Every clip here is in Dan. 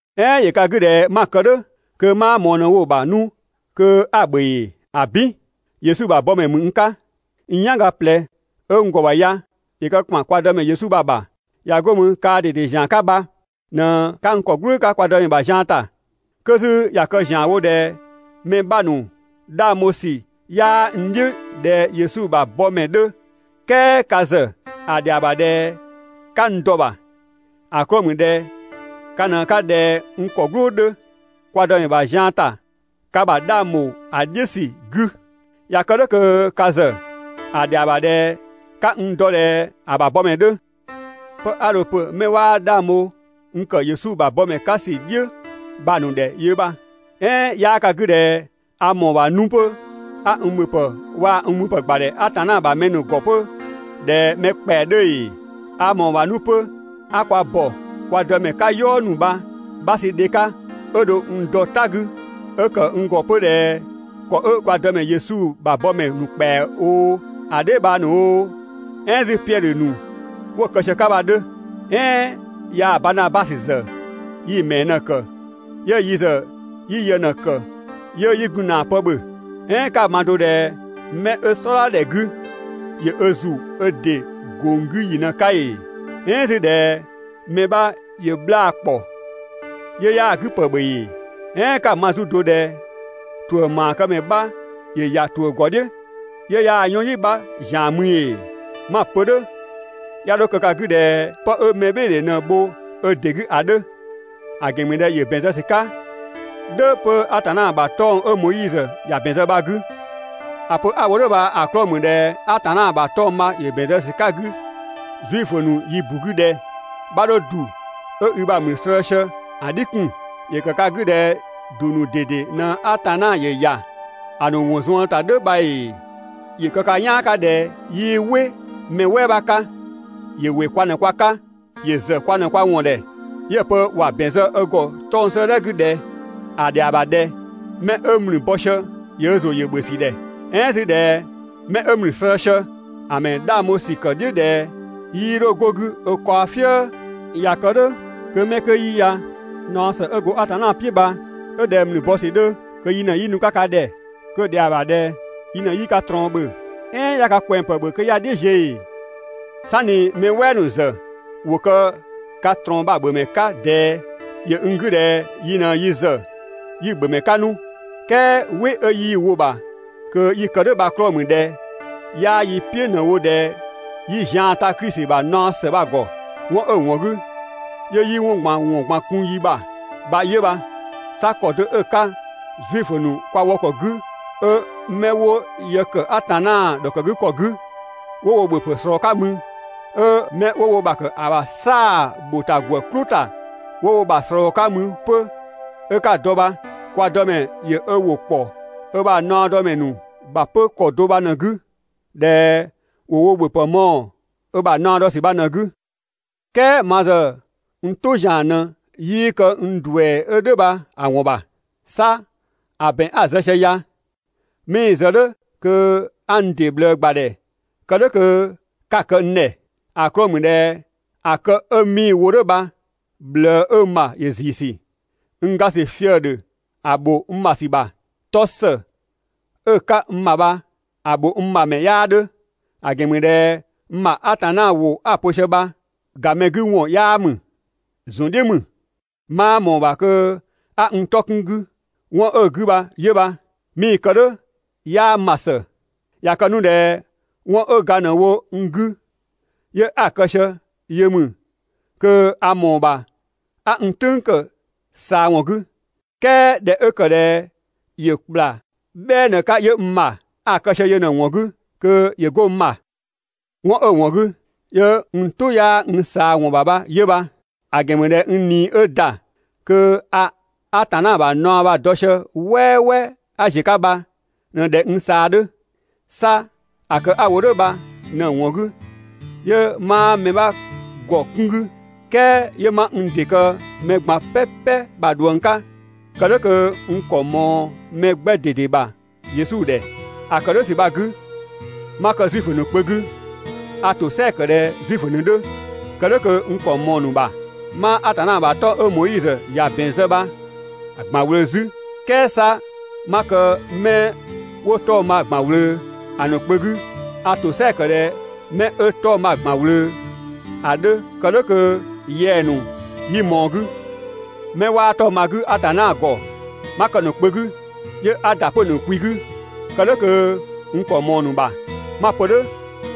"Ɛɛn ‑yö ka 'gü ꞊dhɛ 'ma‑ kë "dhʋ̈ kö 'maa ꞊mɔɔ ꞊në‑ wo‑ ‑bha 'nu kö 'a‑ ‑bhö ‑ee? ‑Abin! Yesu ‑bha bɔmɛ ‑mü n 'ka! N "yanga ꞊plɛ 'ö n ‑gɔ ‑bha ya ‑yö kë ‑kpan kwa Dëmɛ Yesu bha‑ ‑bha! ꞊Ya 'go mü, kaa ꞊dede ‑zian 'ka bha ꞊në 'ka n ‑kɔ "gblʋʋ 'ka kwa Dëmɛ ‑bha zian ‑ta! 'Kö 'zü ꞊ya kë ‑zianwo ꞊dhɛ mɛ 'bha ‑nu 'dhang bho ‑sü 'yaa n "dhiʋ̈ ꞊dhɛ Yesu ‑bha bɔmɛ 'dhö, "kɛɛ ka ‑zë ‑a ‑dhɛa ‑bha ꞊dhɛ 'ka n dɔ‑ ‑bha. ‑A 'klɔɔ‑ ‑mü ꞊dhɛ ka ꞊në 'ka ꞊dhɛ n ‑kɔ "gblʋʋ 'dhö kwa Dëmɛ ‑bha zian ‑ta ka ‑bha 'dhang ‑bho ‑a "dhiʋ̈ ‑sü 'gü. ꞊Ya kë "dhʋ̈ kö ka ‑zë ‑a ‑dhɛa ‑bha ꞊dhɛ 'ka n dɔ ꞊dhɛ ‑a ‑bha bɔmɛ 'dhö. 'Pë 'a dho‑ pö 'mɛ 'waa 'dhang bho n ‑kë Yesu ‑bha bɔmɛ 'ka ‑sü "dhiʋ̈ bha‑ ‑nu ‑dhɛ 'yö bha. "Ɛɛn 'yaa ka 'gü ꞊dhɛ a ‑mɔɔ ‑bha 'nu 'pö 'a n ‑bhöpë waa‑ n müpë ‑gbadhɛ Atanna ‑bha mɛ ‑nu ‑gɔ 'pö ꞊dhɛ mɛ ‑kpɛa 'dhö ‑ee? A ‑mɔɔ ‑bha 'nu 'pö 'a kwa ‑bɔ kwa Dëmɛ 'ka "yɔɔ ‑nu bha‑ 'bha sü dhe 'ka 'ö dho n dɔ "ta 'gü 'ö kë n ‑gɔ 'pö ꞊dhɛ ‑kɔ 'ö kwa Dëmɛ Yesu ‑bha bɔmɛ ‑nu ‑kpɛa oo, a dheebhang ‑nu oo, "ɛɛn 'zü Piɛdhö ‑nu 'wo‑ kë sië‑ 'ka bha‑ 'dhö. "Ɛɛn yaa Baanabasö ‑zë yi‑ ‑mɛɛ ꞊në‑ ‑kë 'yö yi ‑zë 'yi yë ꞊në‑ ‑kë 'yö 'yi gun ‑na pë ‑bhö? "Ɛɛn 'ka‑ ma do ꞊dhɛ 'mɛ 'ö "sɔdha ‑dhɛ 'gü ‑yö ö ‑zu 'ö ‑dɩ ‑gong 'gü ‑yi ꞊në‑ 'ka ‑ee? "Ɛɛn 'zü ꞊dhɛ mɛ 'bha ‑yö 'bhlaa‑ ‑kpɔ 'yö 'yaa‑ 'gü ‑pë ‑bhö ‑ee? "Ɛɛn 'ka‑ ma 'zü do ꞊dhɛ ‑tuʋ̈ ‑maakëmɛ 'bha ‑yö ‑ya ‑tuʋ̈ ‑gɔ "dhiʋ̈ 'yö 'yaa‑ 'yɔnyi 'bha ‑zian mü ‑ee? 'Ma‑ pö "dhʋ̈ 'ya 'dho kë ka 'gü ꞊dhɛ 'pë 'ö mɛbhɩɩdhe ꞊në‑ bho ö ‑dɩ 'gü ‑a 'dhö. ‑A ‑gɛn ‑mü ꞊dhɛ ‑yö ‑bɛn zë ‑sü 'ka "dhʋ̈ 'pö Atanna ‑bha 'tɔng‑ 'ö Moizö ‑ya ‑bɛn zë bha‑ 'gü. ‑A pö 'a‑ wo "dhʋ̈ bha‑ 'klɔɔ‑ ‑mü ꞊dhɛ Atanna ‑bha 'tɔng‑ bha ‑yö ‑bɛn zë ‑sü 'ka‑ 'gü (Zuifö ‑nu yi ‑bu 'gü) ꞊dhɛ: «'Bha 'dho ‑du 'ö i ‑bha ‑mlü slëë‑ sië ‑a "dhi 'kun.» ‑Yö ka 'gü ꞊dhɛ ‑du ‑nu ꞊dede ꞊në Atanna ‑yö ‑ya ‑a ‑nu ‑wɔn zuën ‑ta "dhʋ̈ bha ‑ee? ‑Yö kë ka "yaan ꞊dhɛ 'yii "wɩ mɛ "wɛɛ 'bha 'ka, ‑yö ‑wɩ kwa ꞊në kwa 'ka, ‑yö ‑zë kwa ꞊në kwa ‑wɔn ‑dhɛ 'yö‑ pö ‑wa ‑bɛn zë ö ‑gɔ 'tɔng‑ 'sëëdhɛ 'gü ꞊dhɛ: «‑A ‑dhɛa ‑bha ꞊dhɛ 'mɛ 'ö ‑mlü bɔ sië ‑yö ö ‑zʋ yö‑ ‑bhö ‑sü ‑dhɛ. "Ɛɛn 'zü ꞊dhɛ 'mɛ 'ö ‑mlü slëë‑ sië ‑a ‑mɛ 'dhang bho ‑sü kë‑ "dhiʋ̈ ꞊dhɛ 'yii 'dho 'go‑ 'gü ö kaɔ "fië.» ꞊Ya kë "dhʋ̈, kö 'mɛ 'kö 'yi ya, naɔ ‑së 'ö go Atanna "piʋ̈ bha 'ö ꞊dhɛ ‑mlü bɔ ‑sü 'dhö kö yi ꞊në 'yi nu‑ 'ka ka ‑dhɛ. Kö‑ ‑dhɛa ‑bha ꞊dhɛ yi ꞊në 'yi ka ꞊trɔɔn ‑bhö. "Ɛɛn 'ya ka ꞊kwɛngpë ‑bhö kö 'ya‑ "dhiʋ̈ ziö ‑ee? "Sanni mɛ "wɛɛ ‑nu ‑zë ‑wo kë ka ꞊trɔɔn bha‑ ‑bhö ‑mɛ 'ka ꞊dɛɛ, ‑yö n 'gü ꞊dhɛ yi ꞊në yi ‑zë 'yi‑ ‑bhö ‑mɛ 'ka 'nu. "Kɛɛ "wɩ 'ö 'yii‑ wo‑ ‑bha kö 'yi‑ kë "dhʋ̈ bha‑ 'klɔɔ‑ ‑mü ꞊dhɛ 'yaa yi "piʋ̈ ꞊në‑ wo ꞊dhɛ 'yi zian ta Klisi ‑bha naɔ ‑së bha‑ ‑gɔ. 'Wɔn 'ö‑ ‑wɔn 'gü 'yö 'yi 'wɔn ꞊gban ‑wɔn ꞊gban kun yi ‑bha bha 'yö bha. 'Sa ‑kɔ do 'ö‑ ('ka Zuifö ‑nu kwa wɔ ‑kɔ 'gü 'ö) 'mɛ 'wo yë ‑kë Atanna ‑dhɔkëgükɔ 'gü 'wo wo ‑bhöpë ꞊slɔɔ‑ 'ka mü, 'ö 'mɛ 'wo wo ‑bha ‑kë ‑a ‑bha "saa‑ ‑bho ‑ta ‑gwë "klʋ ‑ta 'wo wo ‑bha ꞊slɔɔ‑ 'ka mü 'pö 'ö 'ka‑ dɔ bha, kwa Dëmɛ ‑yö ö ‑wʋ ‑kpɔ 'ö ‑bha naɔdɔmɛ ‑nu ‑bha 'pö ‑kɔ do bha ꞊në‑ 'gü ꞊dhɛ ‑wo wo ‑bhöpë mɔɔ‑ ö ‑bha naɔ dɔ ‑sü bha ꞊në‑ 'gü. "Kɛɛ ma ‑zë n "tʋ ‑zian ꞊në 'yii kë n ‑duɛ 'ö "dhʋ̈ bha‑ ‑wɔn ‑bha. 'Sa ‑a ‑bɛn 'a‑ zë sië ya 'mii‑ zë "dhʋ̈ kö 'a n ‑dɩ ꞊bhlëë ‑gbadhɛ kë "dhʋ̈ kö 'ka‑ kë n ‑dhɛ. ‑A 'klɔɔ‑ ‑mü ꞊dhɛ ‑a kë 'ö 'mii‑ wo "dhʋ̈ bha‑ ꞊bhlëë 'ö n ‑bha ‑yö ‑ziisü. N ga ‑sü fië‑ ‑dhö ‑a ‑bho n ‑bha ‑sü ‑bha. 'Tɔ ‑së 'ö‑ 'ka n ‑bha bha‑ ‑bho n ‑bha ‑mɛ 'yaa 'dhö. ‑A ‑gɛn ‑mü ꞊dhɛ n ‑bha Atanna ‑wʋ 'a‑ pö sië bha gamɛ 'gü ‑wɔn 'yaa ‑mü. ‑Zun "dhiʋ̈ ‑mü. 'Maa ꞊mɔɔ‑ ‑bha kö 'a n 'tɔ 'kun‑ 'gü 'wɔn 'ö‑ 'gü bha 'yö bha, 'mii‑ kë "dhʋ̈ 'yaa n ‑bha ‑së. ꞊Ya kë 'nu ꞊dhɛ 'wɔn 'ö ga ꞊në wo n 'gü 'yö 'a‑ kë sië yö ‑mü, kö a ‑mɔɔ ‑bha 'a n "tʋ̈ng ‑kë ꞊saa ‑wɔn 'gü, "kɛɛ ꞊dhɛ 'ö ‑kë ꞊dhɛ ‑yö ‑kpla "bhɛɛ ꞊në‑ 'ka 'yö n ‑bha, a‑ kë sië yö ꞊në‑ ‑wɔn 'gü kö ‑yö 'go n ‑bha. 'Wɔn 'ö‑ ‑wɔn 'gü 'yö n "tʋ 'yaa n ꞊saa ‑wɔn ‑bha bha 'yö bha, ‑a ‑gɛn ‑mü ꞊dhɛ n ꞊nii 'ö ‑da kö a Atanna ‑bha ꞊naɔ bha‑ dɔ sië "wɛɛwɛɛ a ꞊ziö‑ 'ka bha ꞊në ꞊dhɛ n ꞊saa 'dhö. ('Sa ‑a kë 'a‑ wo "dhʋ̈ bha) ꞊në‑ ‑wɔn 'gü 'yö 'maa mɛ 'bha ‑gɔ 'kun 'gü, "kɛɛ 'yö 'ma n ‑dɩ kë mɛ ꞊gban "pɛpɛ ‑bha ꞊dhuëng 'ka kë "dhʋ̈ kö n ‑kɔ ꞊mɔɔ mɛ 'gbɛ ꞊dede ‑bha (Yesu ‑dhɛ). ‑A ‑kë "dhʋ̈ ‑sü bha‑ 'gü 'ma kë Zuifö ‑nu kpö 'gü a ‑tosɛa ‑kë ꞊dhɛ Zuifö ‑nu 'dhö kë "dhʋ̈ kö n ‑kɔ ꞊mɔɔ‑ ‑nu ‑bha. 'Maa Atanna ‑bha 'tɔng‑ 'ö Moizö ‑ya ‑bɛn zë bha‑ ‑gban ꞊wlöö 'zü, "kɛɛ 'sa 'ma kë 'mɛ 'wo 'tɔng‑ bha‑ ‑gban ꞊wlöö ‑a ‑nu kpö 'gü, a ‑tosɛa ‑kë ꞊dhɛ 'mɛ 'ö 'tɔng‑ bha‑ ‑gban ꞊wlöö, ‑a 'dhö kë "dhʋ̈ kö yɛng‑ ‑nu 'yi ꞊mɔɔ‑ 'gü. 'Mɛ 'waa 'tɔng‑ bha‑ 'gü Atanna ‑gɔ 'ma kë‑ ‑nu kpö 'gü, 'yö 'a ‑da 'pö‑ ‑nu kwi 'gü, kë "dhʋ̈ kö n ‑kɔ ꞊mɔɔ‑ ‑nu ‑bha. 'Ma‑ pö "dhʋ̈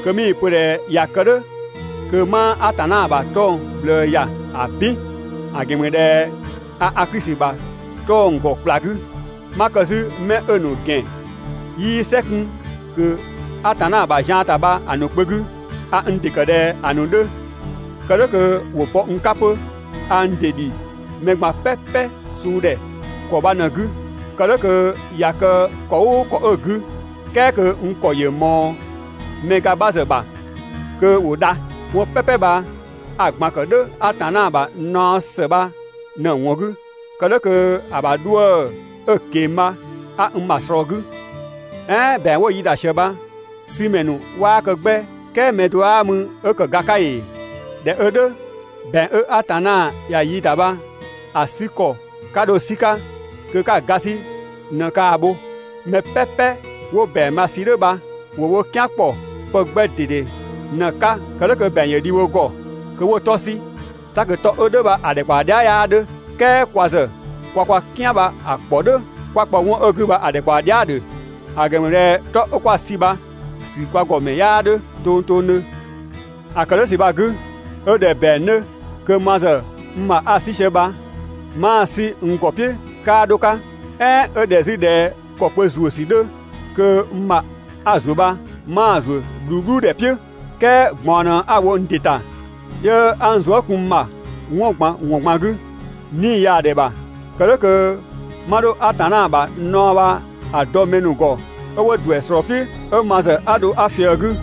kö 'mii‑ pö ꞊dhɛ ꞊ya kë "dhʋ̈ kö 'maa Atanna ‑bha 'tɔng‑ ꞊bhlëë ‑ya. ‑Abin! ‑A ‑gɛn ‑mü ꞊dhɛ a Klisi ‑bha 'tɔng‑ ‑gɔ ‑kpla 'gü. 'Ma kë 'zü 'mɛ 'ö‑ ‑nu ‑gɛn 'yii "sɛ 'kun ꞊kö Atanna ‑bha zian ‑ta bha‑ ‑nu kpö 'gü, a n ‑dɩ ‑kë ꞊dhɛ ‑a ‑nu 'dhö kë "dhʋ̈ kö ‑wo bɔ n 'ka 'pö. A n ‑dɩ ‑dhi mɛ ꞊gban "pɛpɛ suu ‑dhɛ ‑kɔ bha ꞊në‑ 'gü kë "dhʋ̈ kö ꞊ya kë ‑kɔ "ʋʋ ‑kɔ 'ö‑ 'gü, "kɛɛ kö n ‑kɔ ‑yö ‑mɔɔ mɛ ga 'bha ‑zë ‑bha kö ‑wo dha. 'Wɔn "pɛpɛ bha a‑ ꞊gban ‑kë "dhʋ̈ Atanna ‑bha naɔ ‑së bha ꞊në‑ ‑wɔn 'gü kë "dhʋ̈ kö‑ ‑bha 'dhuë‑ 'ö‑ ꞊keng‑ bha 'a n ‑bha ꞊slɔɔ‑ 'gü. "Ɛɛn ‑bɛang 'wo‑ yi ‑dang ꞊sië bha‑ 'sü ‑mɛ ‑nu 'waa kë 'gbɛ "kɛɛ mɛ do 'aa mü 'ö ‑kë ga 'ka ‑ee? ꞊Dhɛ 'ö "dhʋ̈, ‑bɛang 'ö Atanna ‑ya yi ‑da bha‑ 'sü ‑kɔ 'ka dho‑ 'sü‑ 'ka kö 'ka‑ ga 'sü ꞊në ‑kaa bho. Mɛ "pɛpɛ 'wo ‑bɛang bha‑ sü "dhʋ̈ bha ‑wo wo "kian ‑kpɔ pë 'gbɛ ꞊dede ꞊në‑ 'ka kë "dhʋ̈ kö ‑bɛang ‑yö dhi wo ‑gɔ kö 'wo 'tɔ 'sü, 'sa kö 'tɔ 'ö "dhʋ̈ bha‑ ‑dhɛkpaɔ dhia" 'yaa 'dhö. "Kɛɛ kwa ‑zë 'kwa kwa "kian bha‑ 'kpɔ "dhʋ̈, 'kwa‑ kpɔ 'wɔn 'ö‑ 'gü bha‑ ‑dhɛkpaɔ dhia" ‑dhö. ‑A ‑gɛn ‑mü ꞊dhɛ 'tɔ 'ö kwaa‑ 'sü bha‑ ‑sü kwa ‑gɔ ‑mɛ 'yaa 'dhö tongtongdhö. ‑A ‑kë "dhʋ̈ ‑sü bha‑ 'gü, 'ö ꞊dhɛ ‑bɛang 'dhö kö ma ‑zë n ‑bha 'a‑ 'sü sië bha 'maa‑ 'sü n ‑gɔ "piʋ̈ 'kaa 'dho‑ 'ka. "Ɛɛn 'ö ꞊dhɛ 'zü ꞊dhɛ ‑kɔkpö ‑zuö ‑sü 'dhö kö n ‑bha 'a ‑zuö bha 'maa‑ ‑zuö "bhluubhludhɛ "piʋ̈. "Kɛɛ ꞊gbaɔn ꞊në 'a‑ wo n ‑dɩ ‑ta, 'yö 'a n zuë" kun n ‑bha 'wɔn ꞊gban ‑wɔn ꞊gban 'gü, 'nii‑ yaa ‑dhɛ ‑bha, kë "dhʋ̈ kö 'ma 'dho Atanna ‑bha naɔ bha‑ dɔ mɛ ‑nu ‑gɔ 'ö 'wo ‑duɛ ꞊slɔɔ‑ "piʋ̈ 'ö ma ‑zë 'a dho 'a ꞊fië‑ 'gü.